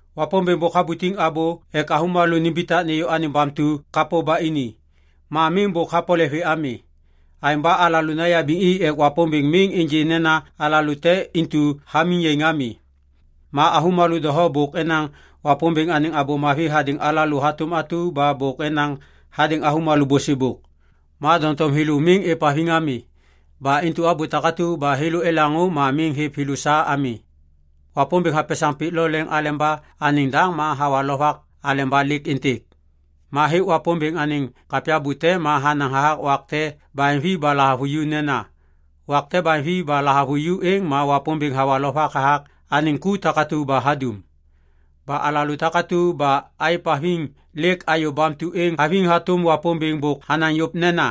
Wapômbêŋ bôk habutiŋ abô ek avômalô nimbitak nêyô anêŋ bamtu kapô ba ini. Ma miŋ bôk hapole vê ami. Aêŋ ba alalô nayabiŋ i ek Wapômbêŋ miŋ ênjê nena alalô te intu hamiŋ yaiŋ ami. Ma avômalô doho bôk enaŋ Wapômbêŋ anêŋ Abô Mavi hadêŋ alalô hatôm atu ba bôk enaŋ hadêŋ avômalô bôsêbôk. Ma doŋtom thêlô miŋ êvhaviŋ ami. Ba intu abô takatu ba thêlô elaŋô ma miŋ hêv thêlô sa ami. Wapômbêŋ hapesaŋ pik lo leŋ aleba anêŋ daŋ ma hawa lovak aleba lêk êntêk. Ma hêk Wapômbêŋ anêŋ kapya bute ma hanaŋ hathak wak te baheŋvi ba lahavuju nena, “Wak te baheŋvi ba lahavuju êŋ ma Wapômbêŋ hawa lovak hathak anêŋ ku takatu ba hadum.” Ba alalô takatu ba aêvhaviŋ lêk ayô bamtu êŋ haviŋ hatôm Wapômbêŋ bôk hanaŋ yôv nena,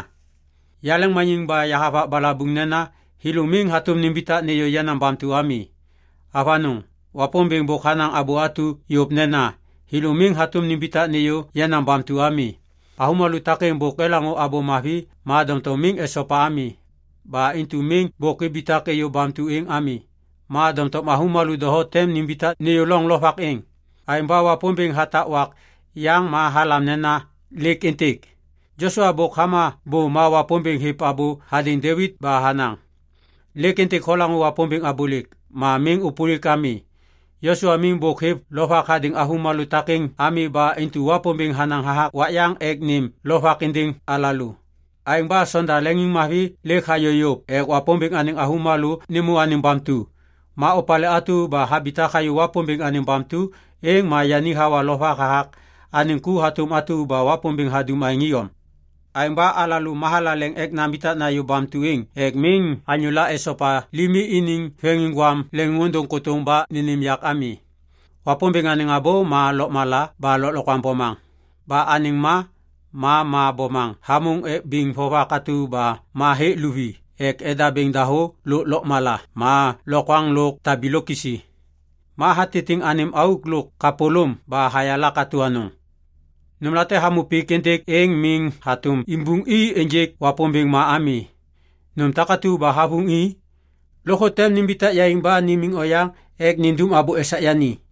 “Yaleŋmaniŋ ba yahavak balabuŋ nena, ‘Thêlô miŋ hatôm nimbitak nêyô yenaŋ bamtu ami.’” Avanôŋ! Wapômbêŋ bôk hanaŋ abô atu yôv nena, “Thêlô miŋ hatôm nimbitak nêyô yenaŋ bamtu ami.” Avômalô takêŋ bôk elaŋô Abô Mavi ma doŋtom miŋ esopa ami. Ba intu miŋ bôk ibitak êyô bamtu êŋ ami. Ma doŋtom avômalô doho tem nimbitak nêyô loŋ lovak êŋ. Aêŋ ba Wapômbêŋ hatak wak yaŋ ba halam nena “Lêk êntêk”. Josua bôk hama bô ma Wapômbêŋ hêv abô hadêŋ Devit ba hanaŋ, “Lêk Êntêk holaŋô Wapômbêŋ abôlêk, ma miŋ ôpôlik ami.” Josua miŋ bôk hêv lovak hadêŋ avômalô takêŋ ami ba intu Wapômbêŋ hanaŋ hathak wak yaŋ ek nêm lovak êndêŋ alalô. Aêŋ ba sonda leŋiŋmavi lêk hayô yôv ek Wapômbêŋ anêŋ avômalô nêmô anêŋ bamtu. Ma opalê atu ba habitak hayô Wapômbêŋ anêŋ bamtu êŋ ma yani hawa lovak hathak anêŋ ku hatôm atu ba Wapômbêŋ hadum aêŋ iyom. Aêŋ ba alalô mathalaleŋ ek nambitak nayô bamtu êŋ ek miŋ anyôla esopa limi iniŋ veŋiŋgwam leŋôndôŋ kôtôŋ ba nênêm yak ami. Wapômbêŋ anêŋ abô ma lôkmala ba lôklokwaŋ bomaŋ. Ba anêŋ ma, ma ma bomaŋ hamôŋ ek biŋ vovak atu ba ma hêk luvi ek edabêŋ dahô lôk lôkmala ma lokwaŋ lôk tabilôk kisi. Ma hatitiŋ anêm auk lôk kapôlôm ba hayala katô anôŋ. Nômlate hamô pik êntêk êŋ miŋ hatôm imbuŋ i ênjêk Wapômbêŋ ma ami. Nôm takatu ba havuŋ i, lôkthô tem nimbitak yaiŋ ba nimiŋ oyaŋ ek nindum abô esak yani.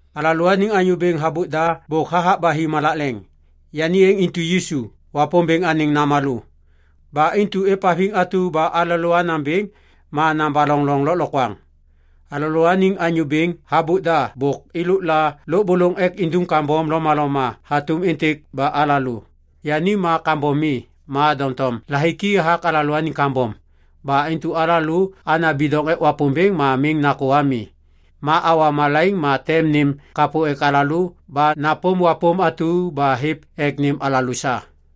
Alalôaniŋ anyô bêŋ habôk da bôk hathak ba hi malak leŋ. Yani êŋ intu Yisu, Wapômbêŋ anêŋ namalô. Ba intu êvhaviŋ atu ba alalô anaŋ bêŋ ma nabaloŋ loŋ lôklokwaŋ. Alalôaniŋ anyô bêŋ habôk da bôk êlôk la lôbôlôŋ ek indum kambom lomaloma hatôm êntêk ba alalô. Yani ma kambom mi. Ma doŋtom lahiki hathak alalôaniŋ kambom. Ba intu alalô ana bidoŋ ek Wapômbêŋ ma miŋ nakô ami. Ma awa malaiŋ ma tem nêm kapô ek alalô ba napôm wapôm atu ba hêv ek nêm alalô sa.